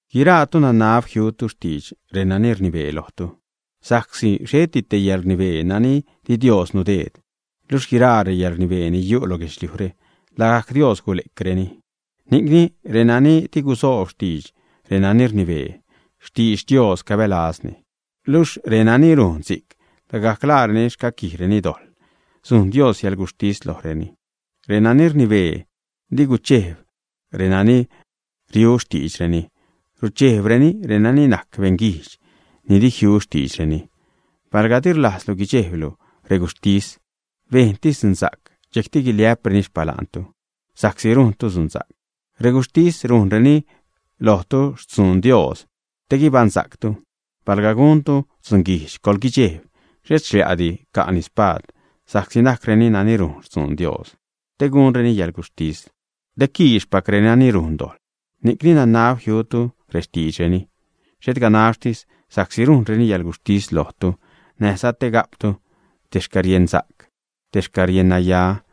Guiraatu nanab jiutu xtidx renani rnibee lojtu. Sa'csi xheti te yäḻrnibee nani di Dios nudeed, luxh guiraa reyäḻrnibee ni yu' lo guedxliujre, lagajc Dios gule'creni. Ni'cni renani di gusoob xtidx renani rnibee, xtidx Dios cabälazni. Luxh renani rujn si'c, lagajc laareni xcaquijreni dojḻ, sujn Dios yäḻguxhtis lojreni. Renani rnibee di guchejb renani riu xtiidxreni, ruchejbreni renani najc beṉ guijdx ni di jiu xtiidxreni. Palga di rlajztu guidxejbtu reguxhtis, bejntis dzunsa'c, dxejcti guiliä'preni xpala'ntu sa'csi rujntu dzunsa'c. Reguxhtis rujnreni lojtu xtzuun Dios te guibaṉsa'ctu. Palga guntu dzunguijdx, coḻguidxejb, xhet xlia'di ca'ni spaad, sa'csi najcreni nani rujn xtzuun Dios te gunreni yäḻguxhtis, te quixpac renani rujn dojḻ. Ni'cni nanab jiutu rextiidxreni, xhet ganaxtis sa'csi rujnreni yäḻguxhtis lojtu, näjza te ga'ptu te xcäriejnsa'c, te xcäriennaya.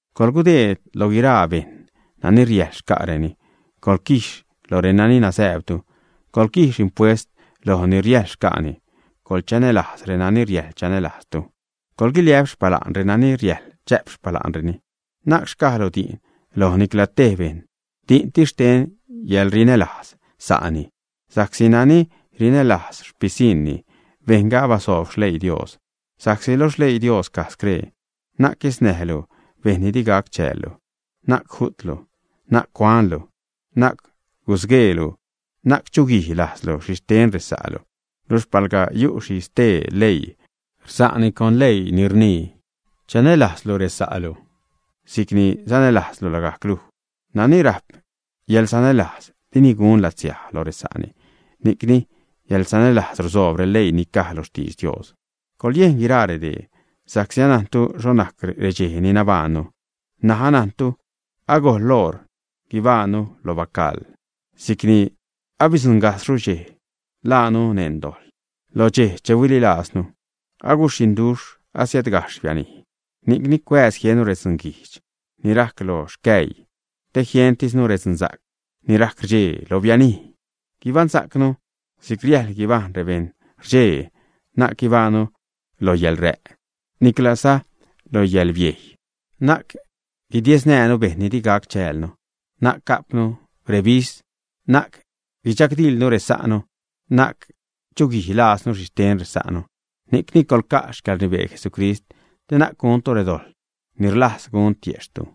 Coḻgudeed lo guiraa bejṉ nani riäjl xca'reni. Coḻquiix loj renani nazääbtu; coḻquijx impuest loj ni riäjl xca'ni; coḻchanälajz renani riäjl chanälajztu; coḻguiliä'p xpala'n renani riäjl chä'p xpala'reni. Na'c xcajlu di'n loj nicla tej bejṉ, di'ntis xten yäḻrinälajz sa'ni, sa'csi nani rinälajz xpisiṉni, bejṉga abasoob xleii Dios. Sa'csi lo xleii Dios caj scree: “Na'c guesnäjlu bejṉ ni di gac chäällu, na'c ju'tlu, na'c cuanlu, na'c gusgueelu, na'c chuguij lajzlu xhixten resa'lu.” Luxh palga yu' xhi stee leii rsa'ni con leii ni rnii: “Chanälajzlu resa'lu si'c sanälajzlu lagajc luj.” Nani rajp yäḻsanälajz, dini gun latsiaj lo resa'ni. Ni'cni yäḻsanälajz rusoob releii ni caj lo xtidx Dios. Coḻyejn guiraa redee, sa'csi anajntu xho najc redxej ni nabajṉnu ṉaj, anajntu alagojl oṟ guibajṉnu lo bacaḻ sa'csi abidzuṉgajxhru dxej che ḻaanu neṉ dojḻ lo dxej che huililajznu. Aguxhiṉduxh, asiädgajxh bianij. Ni'cni cuääz jiennu redzuun guijdx ni rajc lo xcäjy, te jientisnu redzunsa'c ni rajc rdxee, lo bianij. Guibansa'cnu si'c riäjl guibajṉ rebejṉ rdxee, na'c guibaṉnu lo yäḻrä', niclaza lo yäḻbiejy, na'c guidiesnäjnu bejṉ ni di gac chäälnu, na'c ga'pnu rebis, na'c guidxagdiḻnu resa'nu, na'c chuguij lajznu xhixten resa'nu. Ni'cni coḻca' xcäḻrnibee Jesucrist te na'c guntu redojḻ ni rlajz gun tiejxhtu.